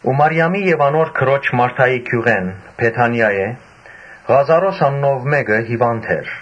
Մարիամին եւ անոր քրոջ Մարթային գիւղէն, Բեթանիայէն, Ղազարոս անունով մէկը հիւանդ էր։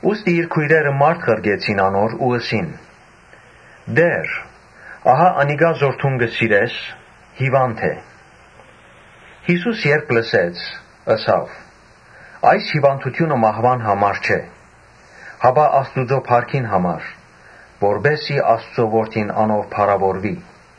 Ուստի իր քոյրերը մարդ ղրկեցին անոր ու ըսին. «Տէ՛ր, ահա անիկա, որ դուն կը սիրես, հիւանդ է»։ Յիսուս, երբ լսեց՝ ըսաւ. «Այս հիւանդութիւնը մահուան համար չէ, հապա Աստուծոյ փառքին համար, որպէս զի Աստուծոյ Որդին անով փառաւորուի»։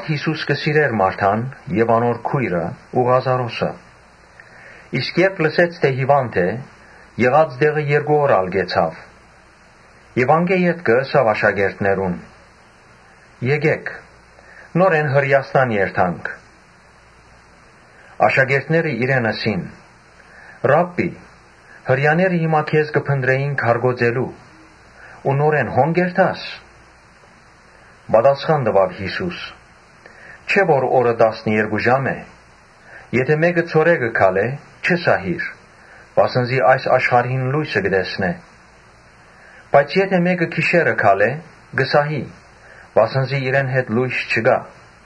Յիսուս կը սիրէր Մարթան եւ անոր քոյրը ու Ղազարոսը։ Երբ լսեց թէ հիւանդ է, եղած տեղը երկու օր ալ կեցաւ։ Անկէ ետքը ըսաւ աշակերտներուն. «Եկէ՛ք, նորէն Հրէաստան երթանք»։ Աշակերտները իրեն ըսին. «Ռաբբի, Հրեաները հիմա քեզ կը փնտռէին քարկոծելու համար, նորէն հո՞ն կ’երթաս»։ Պատասխան տուաւ Յիսուս. «Չէ՞ որ օրը տասներկու ժամ է։ Եթէ մէկը ցորեկը քալէ՝ չի սահիր, վասն զի այս աշխարհին լոյսը կը տեսնէ. Բայց եթէ մէկը գիշերը քալէ՝ կը սահի, վասն զի իրեն հետ լոյս չկայ»։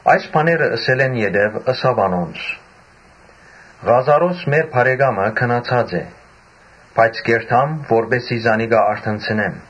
Այս բաները ըսելէն յետոյ ըսաւ անոնց. «Ղազարոս՝ մեր բարեկամը՝ քնացած է, երթամ, որպէս զի զանիկա արթնցնեմ»։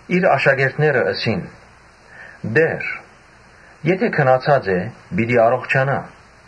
Իր աշակերտները ըսին. «Տէ՛ր, եթէ քնացած է, պիտի արթննայ»։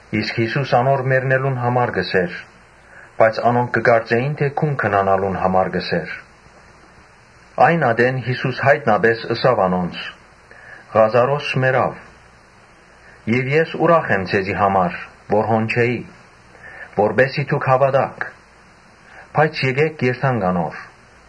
Յիսուս անոր մեռնելուն համար կ’ըսէր, բայց անոնք կը կարծէին թէ քնանալուն մասին կը խօսի։ Այն ատեն Յիսուս յայտնապէս ըսաւ անոնց. «Ղազարոս մեռաւ Եւ ես ուրախ եմ ձեզի համար որ հոն չէի, որպէս զի դուք հաւատաք. բայց եկէ՛ք երթանք անոր»։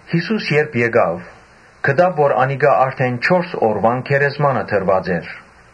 Յիսուս երբ գնաց, գտաւ որ անիկա արդէն չորս օրուան գերեզմանը դրուած էր։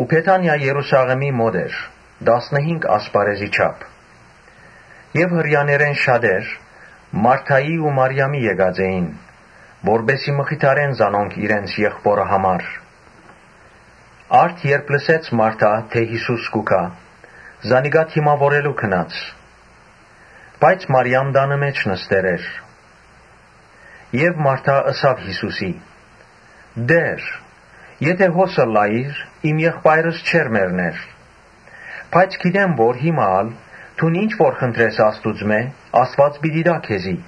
Բեթանիա Երուսաղէմի մօտ էր՝ տասնըհինգ ասպարէզի չափ։ Հրեաներէն շատեր Մարթային ու Մարիամին եկած էին, որպէս զի մխիթարեն զանոնք իրենց եղբօրը համար։ Արդ՝ երբ Մարթան լսեց թէ Յիսուս կու գայ, զանիկա դիմաւորելու գնաց, բայց Մարիամ տանը մէջ նստեր էր։ Մարթա ըսաւ Յիսուսին. «Տէ՛ր, եթէ հոս ըլլայիր, իմ եղբայրս չէր մեռներ. Բայց գիտեմ թէ հիմա ալ դուն ինչ որ խնդրես Աստուծմէ, Աստուած պիտի տայ քեզի»։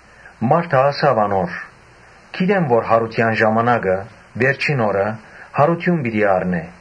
Մարթա ըսաւ անոր. «Գիտեմ թէ յարութեան ժամանակը՝ վերջին օրը՝ յարութիւն պիտի առնէ»։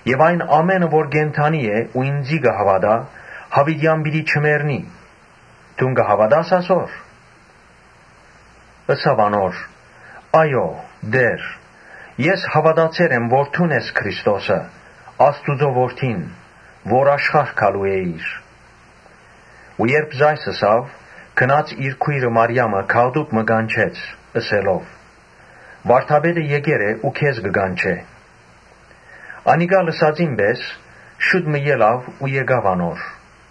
Եւ ան որ կենդանի է ու ինծի կը հաւատայ, յաւիտեան պիտի չմեռնի։ Դուն կը հաւատա՞ս ասոր»։ Ըսաւ անոր. «Այո՛, Տէ՛ր, ես հաւատացեր եմ, որ դուն ես Քրիստոսը՝ Աստուծոյ Որդին՝ որ աշխարհ գալու էիր»։ Ասիկա ըսելէ վերջ, գնաց իր քոյրը Մարիամը գաղտուկ մը կանչեց՝ ըսելով. «Վարդապետը եկեր է ու քեզ կը կանչէ»։ Անիկա լսածին պէս՝ շուտ մը ելաւ ու գնաց անոր։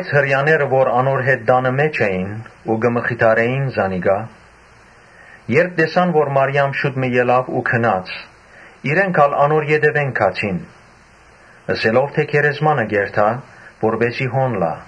Հրեաները, որ անոր հետ տանը մէջ էին ու կը մխիթարէին զանիկա, երբ տեսան թէ Մարիամ շուտ մը ելաւ ու գնաց, իրենք ալ անոր ետեւէն գացին՝ խորհելով թէ գերեզմանը կ’երթայ որպէս զի հոն լայ։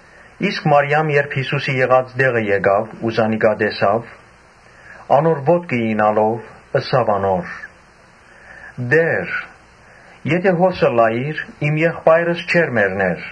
Իսկ Մարիամ, երբ Յիսուսին եղած տեղը հասաւ, զանիկա տեսաւ, անոր ոտքը իյնալով՝ ըսաւ անոր. «Տէ՛ր, եթէ հոս ըլլայիր՝ իմ եղբայրս չէր մեռներ»։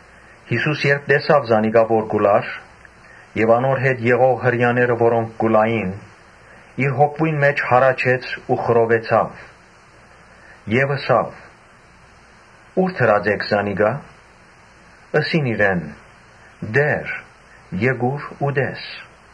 Յիսուս երբ տեսաւ զանիկա որ կու լար եւ անոր հետ եղող Հրեաները, որոնք կու լային, իր հոգիին մէջ հառաչեց ու խռովեցաւ, Եւ ըսաւ. «Ո՞ւր դրած էք զանիկա»։ Ըսին իրեն. «Տէ՛ր, եկուր ու տես»։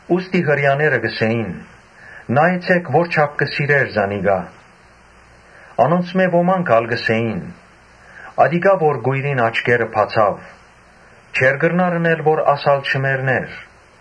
Ուստի Հրեաները կ’ըսէին. «Նայեցէք որչա՜փ կը սիրէր զանիկա»։ Անոնցմէ ոմանք ալ կ’ըսէին. «Ատիկա որ կոյրին աչքերը բացաւ, չէ՞ր կրնար ընել որ աս ալ չմեռնէր»։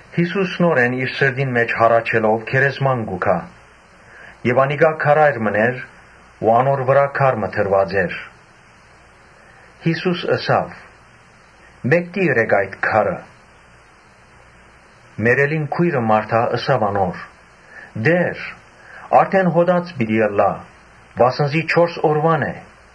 Յիսուս նորէն իր սրտին մէջ հառաչելով գերեզման գնաց։ Անիկա քարայր մըն էր ու անոր վրայ քար մը դրուած էր։ Յիսուս ըսաւ. «Մէկդի՛ ըրէք այս քարը»։ Մեռելին քոյրը՝ Մարթան՝ ըսաւ անոր. «Տէ՛ր, որդէն հոտած պիտի ըլլայ, վասն զի չորս օրուան է»։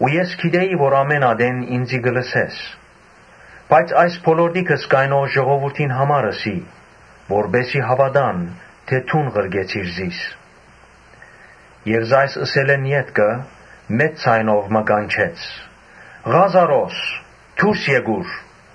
Ես գիտէի թէ ամէն ատեն ինծի կը լսես. բայց այս բոլորտիքս կայնող ժողովուրդին համար ըսի, որպէս զի հաւատան թէ դուն ղրկեցիր զիս»։ Ասիկա ըսելէն ետքը՝ մեծ ձայնով մը կանչեց. «Ղա՛զարոս, դուրս եկուր»։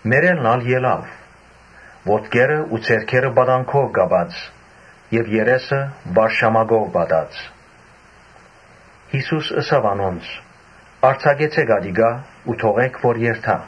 Մեռելն ալ ելաւ՝ ոտքերը ու ձեռքերը պատանքով կապուած եւ երեսը վարշամակով պատուած։ Յիսուս ըսաւ անոնց. «Արձակեցէ՛ք ատիկա ու թողէ՛ք որ երթայ»։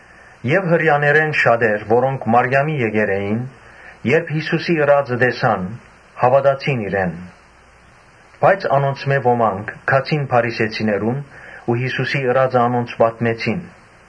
Եւ Հրեաներէն շատեր, որոնք Մարիամին հետն էին, Երբ Յիսուսին ըրածը տեսան, հաւատացին իրեն։ Անոնցմէ ոմանք ալ գացին Փարիսեցիներուն ու Յիսուսին ըրածը անոնց պատմեցին։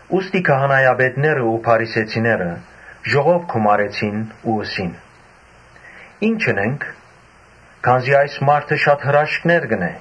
Ուստի քահանայապետներն ու փարիսեցիները ժողով գումարեցին ու ըսին. «Ի՞նչ ընենք, քանզի այս մարդը շատ հրաշքներ կ’ընէ։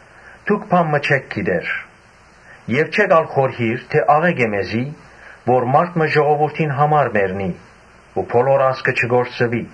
«Դուք բան մը չէ՛ք գիտեր, չէ՛ք ալ խորհիր թէ աղէկ է մեզի՝ որ մարդ մը ժողովուրդին համար մեռնի ու բոլոր ազգը չկորսուի»։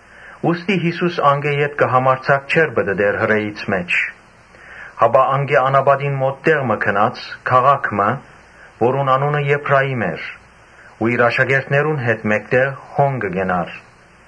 Ուստի Յիսուս ա՛լ համարձակ չէր պտըտեր Հրեաներուն մէջ, հապա անկէ անապատին մօտ տեղ մը գնաց, քաղաք մը, որուն անունը Եփրայիմ էր ու իր աշակերտներուն հետ մէկտեղ հոն կեցաւ։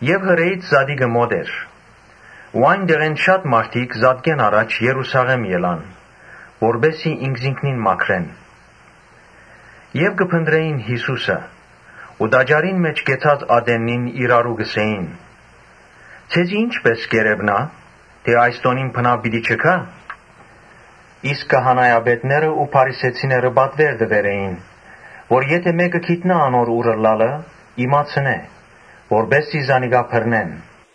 Երբ Հրեաներուն զատիկը մօտեցաւ, անկէ շատ մարդիկ զատկէն առաջ Երուսաղէմ գացին, որպէս զի ինքզինքնին մաքրեն։ Ու կը փնտռէին Յիսուսը ու տաճարին մէջ կեցած ատեննին իրարու կ’ըսէին. «Ձեզի ի՞նչպէս կ’երեւնայ, անշուշտ այս տօնին բնաւ պիտի չգայ»։ Իսկ քահանայապետներն ու փարիսեցիները պատուէր տուեր էին, որ եթէ մէկը գիտնայ անոր ո՛ւր ըլլալը՝ իմացնէ, որպէս զի զանիկա բռնեն։